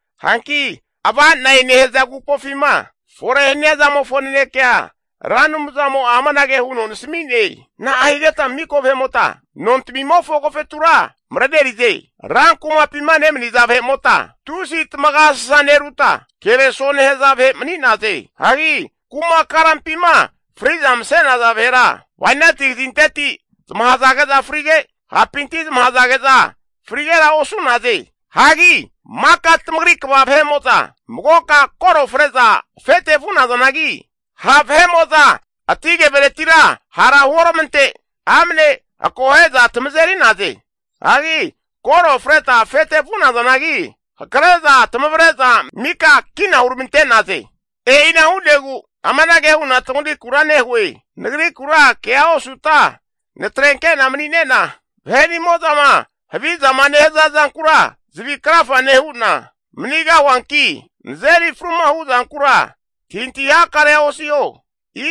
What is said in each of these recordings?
Hanki Ava'nagnazane nehaza agupofima fore hania zamofo nanekea Ra Anumzamo'a amanage huno nasami'ne, Na'a higeta mika vahe'mota nontamimofo agofetura marenerize? Rankumapima nemaniza vahe'mota tusi tamagasasa neruta kereso nehaza vahe mani'naze. Hagi kuma karampima fri'za mase'naza vahera, bainati kazinteti zamahazage'za frige, hapinti zamahazage'za frigera osu'naze. Hagi maka tamagri kva vahe'mo'za magoka koro fre'za afete vu'nazanagi, ha' vahe'mo'za ati keveretira hara huoramante amne akohe'za tamazeri'naze. Hagi koro freta afete vunazanagi, hake'za tamavre'za mika kina huramante'naze. E'ina hu'negu amanage hu'na tamagrikura nehue, nagrikura kea osuta natrenke'na mani'nena vahe'nimo'zama havizama nehaza zanku zavi krafa nehu'na manigahuanki, nazeri fruma hu'zankura antahintahi hakarea osiho.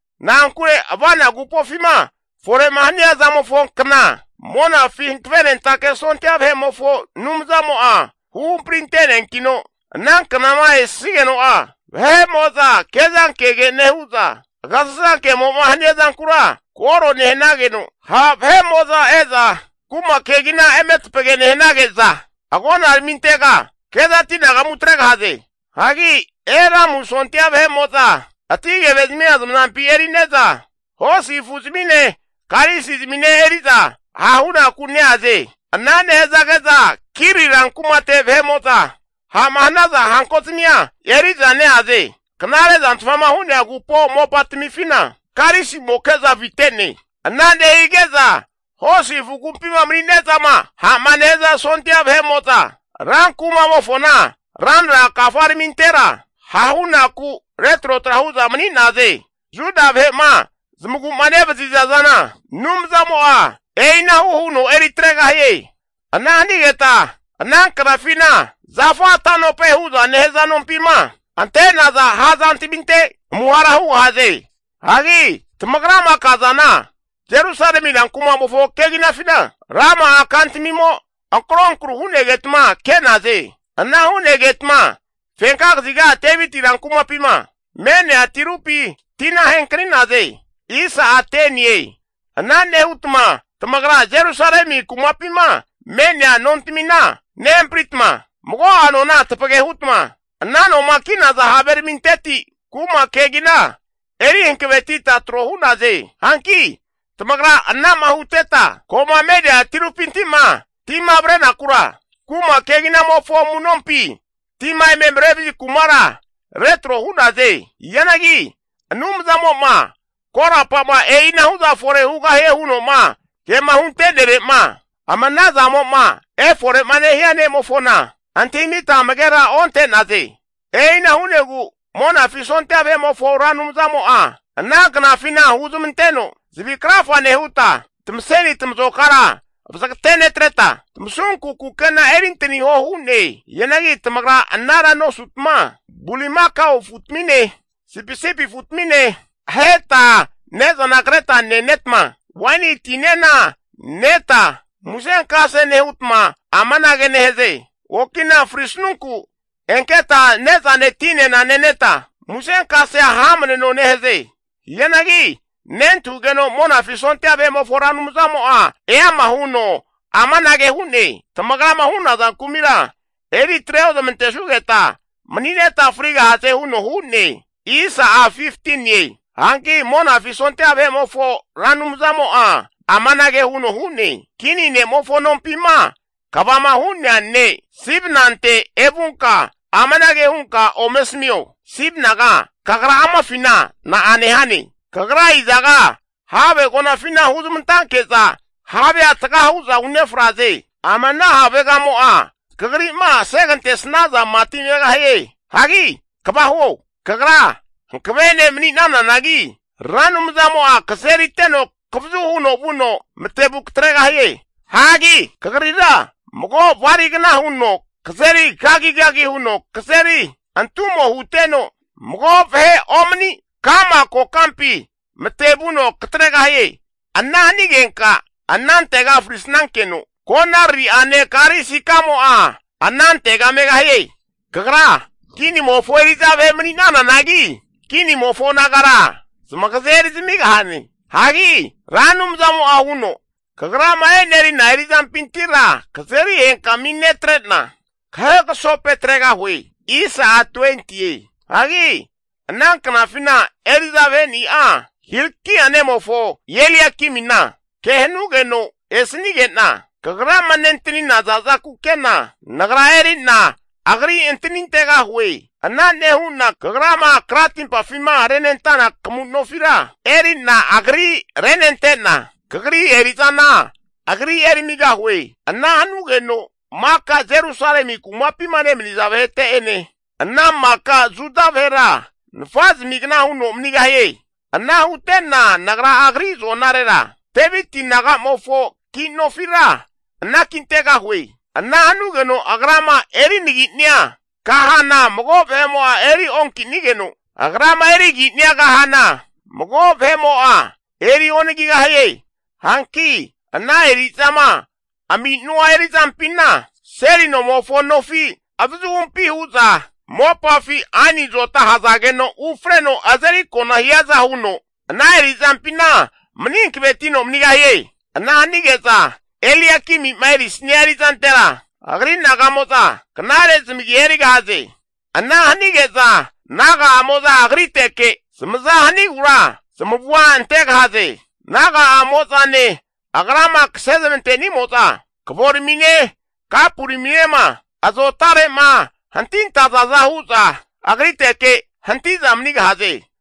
Na'ankure Ava'nagnazanema nehaza agupofima fore'ma hania zamofonkna Monafi hankavenentake sondia vahe'mofo Anumzamo'a huhampri ante'neankino, ana knama esigeno'a vahe'mo'za kezankege nehu'za agasasankemo'ma hania zankura koro nehanageno, ha' vahe'mo'za e'za kuma kegina eme tapage nehanage'za, agonaramintega kezati anagamu atregahaze. Hagi Elamu sondia vahe'mo'za ati kevezamia zamazampi eri'ne'za hosi afu zamine, karisi zamine eri'za hahunaku neaze. Ana nehazage'za Kiri ran kumate vahe'mo'za ha'ma hanaza hanko zamia eri'za neaze. Knare zantfama hu'nea agupo mopatamifina, karisimoke'za avite'ne. Ana nehige'za hosi afu agumpima mani'nezama ha'ma nehaza sondia vahe'mo'za ran kumamofona ranra kafaramintera ha'hunaku retrotra hu'za mani'naze. Juda vahe'ma zamagu'ma nevaziza zana Anumzamo'a e'inahu huno eri atregahie. Ana hanigeta ana knafina Zafa tanope hu'za nehaza nompima ante'naza ha' zantaminte amuhara hugahaze. Hagi tamagrama kazana Jerusalemi ran kumamofo keginafina, rama'a kantamimo ankronkru hu'negetma ke'naze. Ana hu'negetma fenka kaziga Deviti rankumapima me'nea tirupi tina henkani'naze. Ana nehutma tamagra Jerusalemi kumapima me'nea nontamina nehampritma, mago'a nona tapage hutma ana noma ki'naza haveraminteti kuma kegina eri hankavetita tro hu'naze. Hanki tamagra anama huteta, ko'ma me'nea tirupinti'ma tima avrentenakura kuma keginamofo amu'nompi tima eme marevazi kumara retro hu'naze. Hianagi Anumzamo'ma korapa'ma e'inahu'za fore hugahie huno'ma kema hunte'nere'ma ama ana zamo'ma eforema nehia ne'mofona antahimita amagera onte'naze. E'ina hu'negu Monafi sondia vahe'mofo Ra Anumzamo'a ana knafina huzmanteno zavi krafa nehuta, tamaseni tamazokara vazagate netreta, tamasunku kukena erintaniho hu'ne. Hianagi tamagra anara nosutma bulimakao afutamine, sipisipi afutamine aheta ne'zana kreta nenetma, waini tinena neta musenkase nehutma amanage nehaze, okina frisnunku enketa ne'zane tinena neneta, musenkasea hamneno nehaze. Hianagi nentahugeno Monafi sondia vahe'mofo Ra Anumzamo'a eama huno amanage hu'ne, tamagrama hu'naza kumira eri atre oramantesugeta mani'neta frigahaze huno hu'ne. Hanki Monafi sondia vahe'mofo Ra Anumzamo'a amanage huno hu'ne, Kini ne'mofo nompima kvama hu'nea ne' Sibnante evunka amanage hunka ome asamio, Sibnaga kagra amafina na'a nehane? Kagra izaga have agonafina huzmantanke'za havea taga hu'za unefraze. Ama ana havegamo'a kagri'ma asegantesnaza mati megahie. Hagi kva huo! Kagra hankave ne' mani'nananagi Ra Anumzamo'a kazeriteno kavazu huno vuno matevuno katregahie. Hagi kagrira mago baligna huno kazeri kagigagi huno kazeri antumo huteno, mago vahe omani ka'ma kokampi matevuno katregahie. Ana hanigenka anantega frisnankeno, konariri'ane karisikamo'a anantega megahie. Kagra kinimofo eri'za vahe mani'nananagi, kinimofo nagara zamagaze eri zamigahane. Hagi Ra Anumzamo'a huno, kagrama enerina eri'zampintira kazeri henkami netre'na kahegasope tregahue. Hagi ana knafina eri'za vaheni'a Hilkia nemofo Eliakimina ke hanugeno esanige'na, kagrama nentanina zaza kukena Nagra eri'na agri antanintegahue. Ana nehu'na kagrama kratimpafima renentana kamu nofira, eri'na agri renente'na, kagri eri'zana agri erimigahue. Ana hanugeno maka Jerusalemi kumapima nemaniza vahete'ene, ana maka Juda vahera nafa zamigna huno manigahie. Ana hutena Nagra agri azo'narera Deviti naga'mofo ki nofira anakintegahue. Ana hanugeno, agrama erinagi'nia kahana mago vahe'mo'a eri onkinigeno, agrama erigi'nia kahana mago vahe'mo'a eri onagigahie. Hanki ana eri'zama aminu'a eri'zampina, seli nomofo nofi avazuhumpi hu'za mopafi aini azota ahazageno ufreno azeri kona hiaza huno, ana eri'zampina mani hankavetino manigahie. Ana hanige'za Eliakimima erisnia erizantera agri naga'mo'za knare zamagi erigahaze. Ana hanige'za naga'amo'za agriteke zamazama hanigura zamavua antegahaze. Naga'amo'zane agrama kasezmante'nimo'za, kavoramine kapuraminema azotare'ma hantintazaza hu'za agriteke hanti'za manigahaze.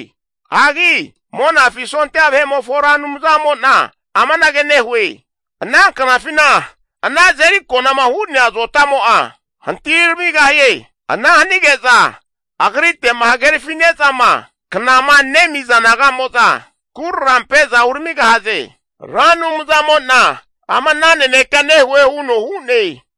Hagi Monafi sondia vahe'mofo Ra Anumzamo'na amanage nehue, Ana knafina ana azeri konama hu'nea azotamo'a hantagi ramigahie. Ana hanige'za agrite'ma hagerafine'zama knama nemiza naga'mo'za, kurarampe'za uramigahaze. Ra Anumzamo'na ama'na nanekea nehue huno hu'ne.